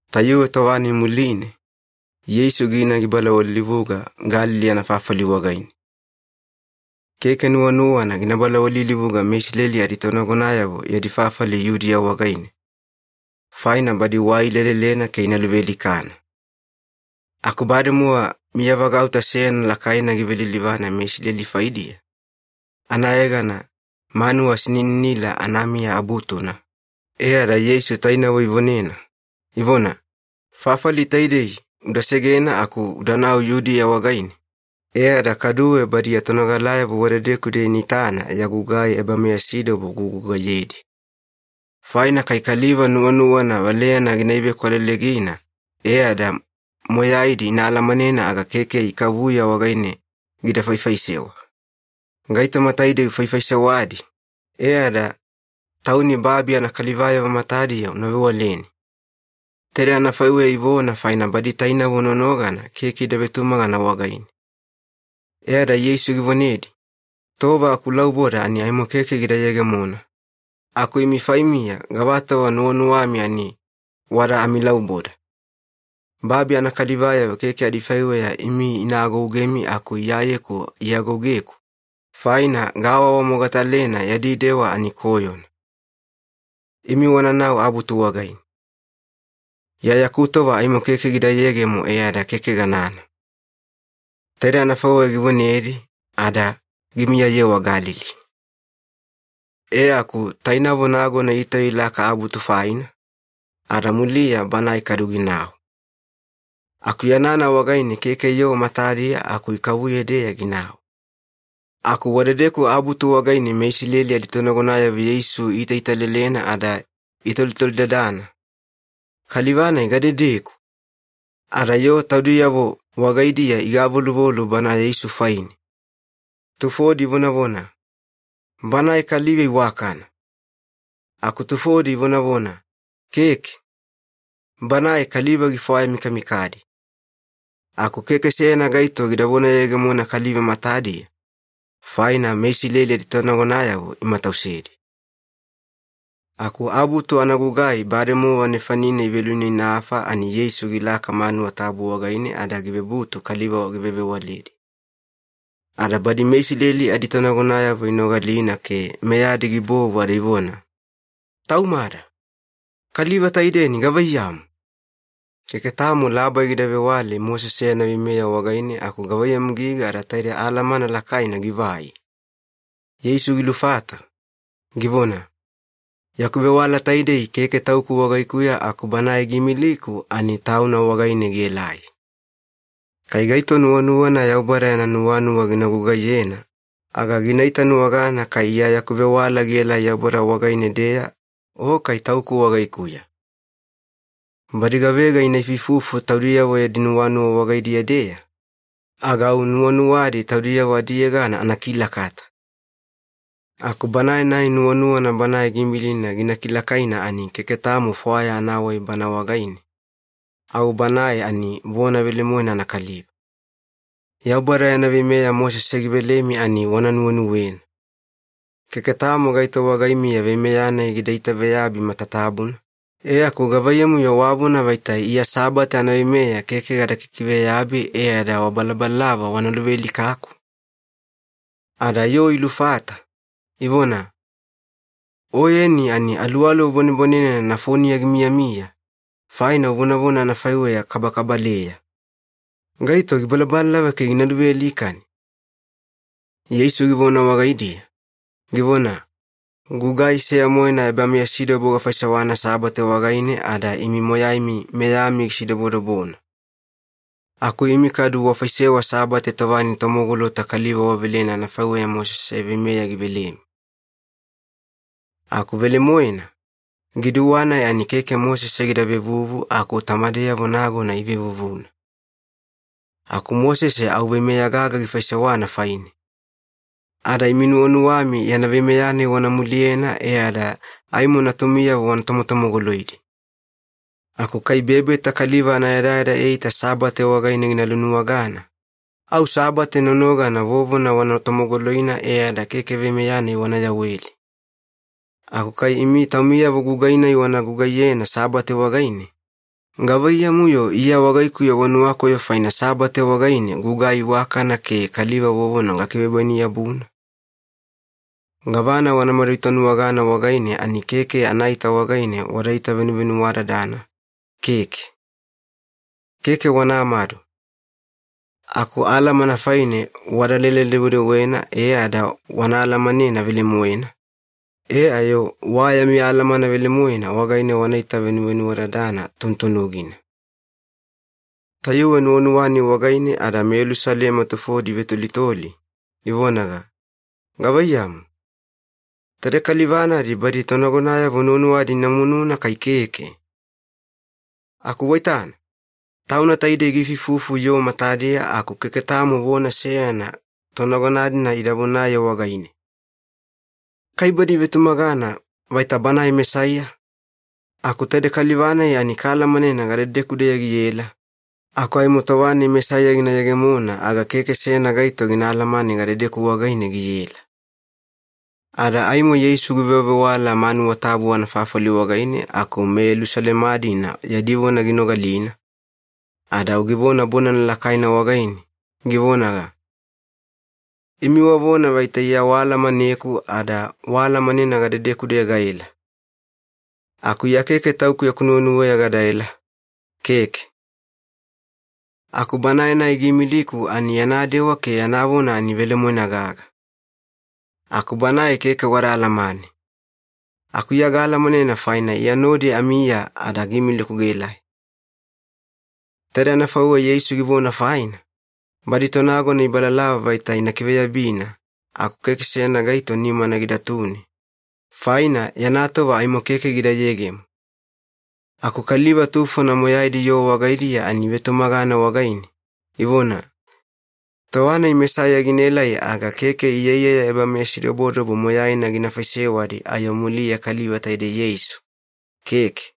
Tayuwe tova-nai muline, Yeisu gina gibalawalilivuga Galili anafafali wagaine. Keke nuwanuwana gina balawalilivuga meIsileli aditonagonayavo yadi fafali Yudiya wagaine, faina badi wai ilelelena ke ina luvealikana. Aku bademowa miyavagauta seyana lakaina givelilivana meIsileli faidiya, anayegana ‘Manuwa Sinininila Anamiya Abutuna’, e ada Yeisu tainavo ivonena, ivona, “Fafali taidei uda segena aku udanau Yudiya wagaine, e ada kaduwe badi ya tonogalayavo wadedeku-deya ina itana ya gugai ebameyasidobo ugugugaiyedi. Faina kai kaliva nuwanuwana valeyana gina iveakwalelegina e ada moyaidi ina alamanena aga keke ikavuya wagaine gida faifaisewa. Gaitoma taidei ufaifaisewadi, e ada Tauni babi anakalivayavo matadiya una vewaleni.” Taidei anafaiweya ivona faina badi tainavo nonogana keke ida vetumagana wagaine. E ada Yeisu givonedi, “Tova akulauboda ani aimo keke gida yegemona, aku imi faimiya gavatova nuwanuwami ani wada amilauboda. Babi anakalivayavo keke adifaiweya imi ina agougemi aku Iyayeku iagougeku, faina gaawaawamogatalena yadi dewa ani koyona. Imi wananau abutu wagaine. Iya yaku tova aimo keke gida yegemo e ada keke ganana.” Taidei anafaiweya givonedi ada gimiyayewa Galili. E aku tainavo nagona itauya ilaka abutu faina, ada muliya banae kadu ginau. Aku yanana wagaine keke yoo matadiya aku ikavuya-deya ginau. Aku wadedeku abutu wagaine meIsileli aditonagonayavo Yeisu iitaitalelena ada itolitolidadana, “Kaliva-nai gadedeku?” Ada yoo taudiyavo wagaidiya igavoluvolu Bana Yeisu faine. Tufodi ivonavona, “Banae kaliva iwakana,” aku tufodi ivonavona, “Keke. Banae kaliva gifwayamikamikadi.” Aku keke seyana gaito gida vonayegemona kaliva matadiya, faina meIsileli aditonagonayavo imatausedi. Aku abutu anagugai bademowa nefanine iveluinainafa ani Yeisu gilaka manuwa tabu wagaine ada givebutu kaliva givewavewaledi. Ada badi meIsileli aditonagonayavo inogalina ke meyadi gibovu ada ivona, “Taumada! Kaliva taidei ani gavaiyamu? Keke tamo labai gida vewale Mosese yana veimeya wagaine aku gavaiyamu giga ada taide alamana lakaina givai?” Yeisu gilufata, givona, “Yaku vewala taidei keke Tauku wagaikuya aku Banae giimiliku ani Tauna wagaine gielai. Kai gaito nuwanuwana Yaubada yana nuwanuwa gina gugaiyena aga gina itanuwagana kai Iya yaku vewala gielai Yaubada wagaine-deya o kai Tauku wagaikuya. Badi gavega ina ifuifufu taudiyavo yadi nuwanuwa wagaidiya-deya, aga au nuwanuwadi taudiyavo adiyegana anakilakata. Aku banae-nai nuwanuwana Banae giimilina gina kilakaina ani keke tamo fwaya anawai bana wagaine, au banae ani vona velemoena anakaliva. Yaubada yana veimeya Mosese givelemi ani wana nuwenuwena. Keke tamo gaito wagaimiya veimeya-nai gida itaveyabi matatabuna, e aku gavaiyamu-yo wavona vaita Iya Sabate anaveimeya keke gada kikiveyabi e ada wabalabalalava wana luvealikaku?” Ada yoo ilufata, ivona, “Oyeni ani aluwaluwa bwanebwanenena nafoniya gimiyamiya, faina uvonavona anafaiweya kabakabaleya. Gaito gibalabalalava ke gina luvealikani?” Yeisu givona wagaidiya, givona, “Gugai seya-moena ebameyasidobo gafaisewana Sabate wagaine ada imi moyaimi meyami gisidobodobona. Aku imi kadu wafaisewa Sabate tova-nai tomogolota kaliva wavelena anafaiweya Mosese veimeya givelemi. Aku velemoena, giduwa-nai ani keke Mosese gida vevuvu aku tamadeyavo nagona ivevuvuna. Aku Mosese au veimeya gaga gifaisewana faine. Ada imi nuwanuwami yana veimeya-nai wana muliyena e ada aimo natumiyavo watomotomogoloidi. Aku kai bebeta kaliva anayadayada eita Sabate wagaine gina lunuwagana, au Sabate nonogana vovona wana tomogoloina e ada keke veimeya-nai wana yaweli. Aku kai imi taumiyavo gugai-nai wana gugaiyena Sabate wagaine, gavaiyamu-yo Iya wagaikuya wanuwakoyo faina Sabate wagaine gagugai iwakana ke kaliva vovona gakivebwaini-yabuna? Gavana wanamadu itanuwagana wagaine ani keke anaita wagaine wadaita venuvenuwadadana, keke. Keke wanamadu, aku alamana faine wadalele-dewedewena e ada wana alamanena velemoena, e ayo wa yami alamana velemoena wagaine wanaita venuvenuwadadana tunutunugina.” Tayuwe nuwanuwa-nai wagaine ada meYelusalema tufodi ivetolitoli, ivonaga, “Gavaiyamu, taide kaliva-nadi badi tonagonayavo nuwanuwadi ina mununa kai keke? Aku waitana, tauna taidei giifuifufu yoo matadiya aku keke tamo vona seyana tonagona-dina ida vonaye wagaine! Kai badi ivetumagana vaita Banae Mesaiya? Aku taidei kaliva-nai ani kaalamanena gadedeku-deya giela, aku aimo tova-nai Mesaiya gina yegemona aga keke seyana gaito gina alamane gadedeku wagaine giela.” Ada aimo Yeisu givewavewala manuwa tabu anafafali wagaine aku meYelusalema-dina yadi vona ginogalina, ada au givona bonana lakaina wagaine, givonaga, “Imi wavona vaita Iya waalamaneku ada waalamanena gadedeku-deya gaela. Aku Iya keke Tauku yaku nuwenuweya gadaela, keke. Aku Banae-nai giimiliku ani yana dewa ke yana vona ani velemoena gaga. Aku Banae keke wada alamane. Aku Iya gaalamanena faina Iya nodi amiya ada giimiliku gaelai.” Taidei anafaiweya Yeisu givona faina, badi tonagona ibalalava vaita ina kiveyabina aku keke seyana gaito nimana gidatune, faina yana tova aimo keke gida yegemo. Aku kaliva tufona moyaidi yoo wagaidiya ani ivetumagana wagaine, ivona, “Tova-nai Mesaiya ginaelai aga keke iyaiyaya ebameyasidobodobo moyaina gina faisewadi ayo muliya kaliva taidei Yeisu, keke.”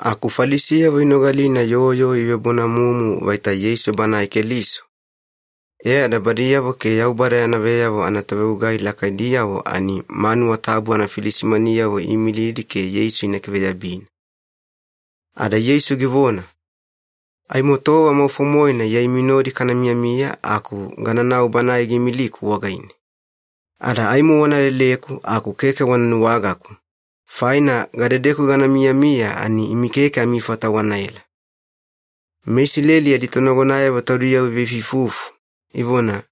Aku Falisiyavo inogalina yoo yoo ivebonamumu vaita Yeisu Banae Keliso, e ada badiyavo ke Yaubada yana veyavo anatovegugai lakaidiyavo ani manuwa tabu anafilisimaniyavo iimilidi ke Yeisu ina kiveyabina. Ada Yeisu givona, “Aimo tova maufo-moena Iya imi nodi kana miyamiya aku gananau Banae giimiliku wagaine. Ada aimo wana leleku aku keke wana nuwagaku, faina gadedeku gana miyamiya ani imi keke amifata wanaela.” MeIsileli aditonagonayavo taudiyavo iveifuifufu, ivona,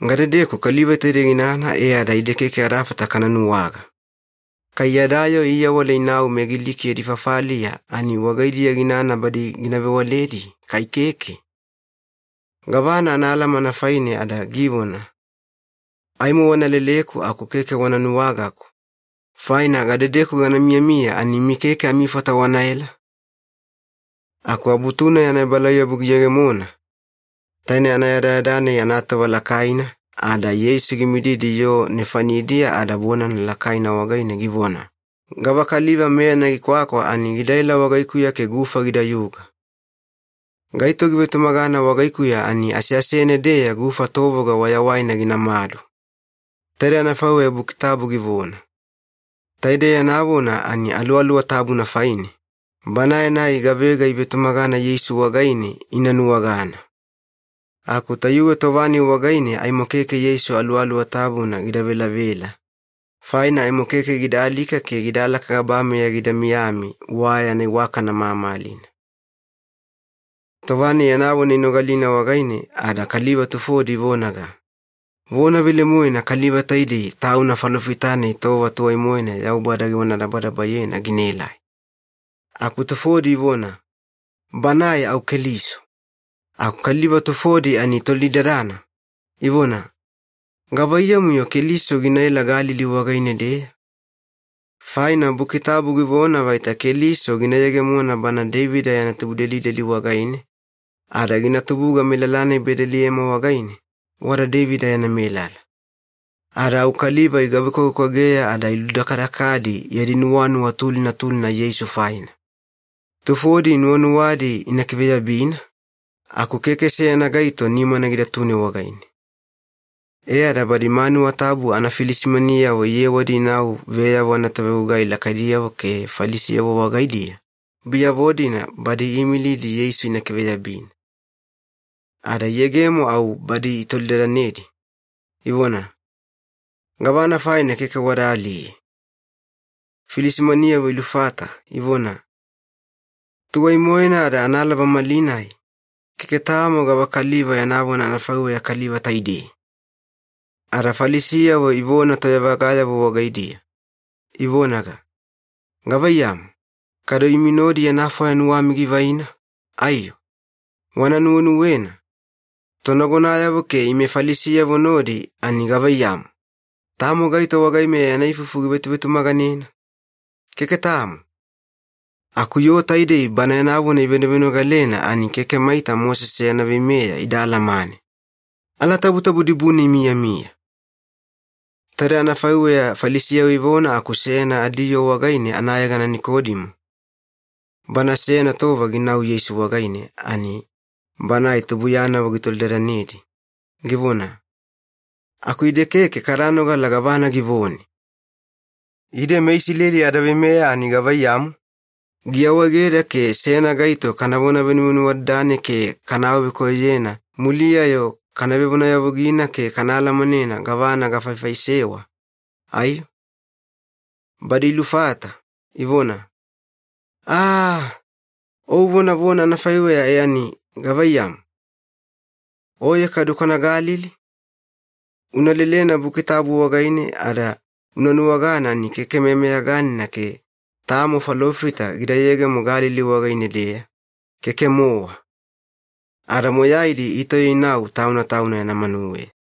“Gadedeku kaliva taidei ginana e ada ide keke adafata kana nuwaga? Kai yada yoo iawala inau meGiliki yadi fafaliya ani wagaidiya ginana badi gina vewaledi, kai keke? Gavana anaalamana faine ada givona, ‘Aimo wana leleku aku keke wana nuwagaku, faina gadedeku gana miyamiya ani imi keke amifata wanaela’?” Aku Abutu-nai anaebalauyabu giyegemona, taine anayadayada-nai anatova lakaina, ada Yeisu gimididi yoo nefanidiya ada bonana lakaina wagaine givona, “Gavakaliva meyana gikwakwa ani gidaela wagaikuya ke gufa gidayuga. Gaito givetumagana wagaikuya ani aseasene-deya gufa tovoga wayawaina ginamadu. Taidei anafaiweya Buki Tabu givona.” Taidei yana vona ani Aluwaluwa Tabuna faine, Banae-nai gavega ivetumagana Yeisu wagaine ina nuwagana. Aku tayuwe tova-nai wagaine aimo keke Yeisu Aluwaluwa Tabuna gida velavela, faina aimo keke gida alika ke gidalaka gabameya gida miyami wa yana iwakana mamalina. Tova-nai yana vona inogalina wagaine ada kaliva tufodi ivonaga, “Vona velemoena kaliva taidei tauna Falofita-nai tova tuwai-moena Yaubada givonadabadabayena ginaelai.” Aku tufodi ivona, “Banae au Keliso.” Aku kaliva tufodi ani itolidadana, ivona, “Gavaiyamu-yo Keliso ginaela Galili wagaine-deya? Faina Buki Tabu givona vaita Keliso gina yegemona bana Deivida yana tubudelideli wagaine, ada gina tubuga melala-nai Bedeliema wagaine, wada Deivida yana melala.” Ada au kaliva igavekwavekwageya ada iludakadakadi yadi nuwanuwa tulina tulina Yeisu faina. Tufodi nuwanuwadi ina kiveyabina, aku keke seyana gaito nimana gidatune wagaine. E ada badi manuwa tabu anafilisimaniyavo iyewadi inau veyavo anatovegugai lakaidiyavo ke Falisiyavo wagaidiya, biyavo-dina badi iimilidi Yeisu ina kiveyabina. Ada iyegemo au badi itolidadanedi, ivona, “Gavana faina keke wada aliye?” Filisimaniyavo ilufata, ivona, “Tuwaina-moena ada analaba malinai, keke tamo gavakaliva yana vona anafaiweya kaliva taidei!” Ada Falisiyavo ivona toyavagayavo wagaidiya, ivonaga, “Gavaiyamu, kadu imi nodi yana fwaya nuwami givaina, aiyo? Wana nuwenuwena, tonagonayavo ke ime Falisiyavo nodi ani gavaiyamu? Tamo gaito wagaimeya yana ifufu givetuvetumaganena? Keke tamo. Aku yoo taidei Bana yana vona ivenovenogalena ani keke maita Mosese yana veimeya ida alamane. Alatabutabu dibune imiyamiya!” Taide anafaiweya Falisiyavo ivona aku seyana adiyoo wagaine anayegana Nikodimo, bana seyana tova ginau Yeisu wagaine ani banae tubuiyanavo gitolidadanedi, givona, “Aku ide keke kada nogala gavana givone. Ide meIsileli adaveimeya ani gavaiyamu, giawaegeda ke seyana gaito kanavona venuvenuwadadane ke kana awavekoyoyena muliya-yo kana vevonayavugina ke kana alamanena gavana gafaifaisewa, aiyo?” Badi ilufata, ivona, “Aaaa, o uvonavona anafaiweya e ani gavaiyamu, oye kadu kwana Galili? Una lelena Buki Tabu wagaine ada una nuwagana ani keke meyameyaganina ke tamo falofita gida yegemo Galili wagaine-deya, keke-mowa.” Ada moyaidi itauya inau tauna tauna yana manuweya.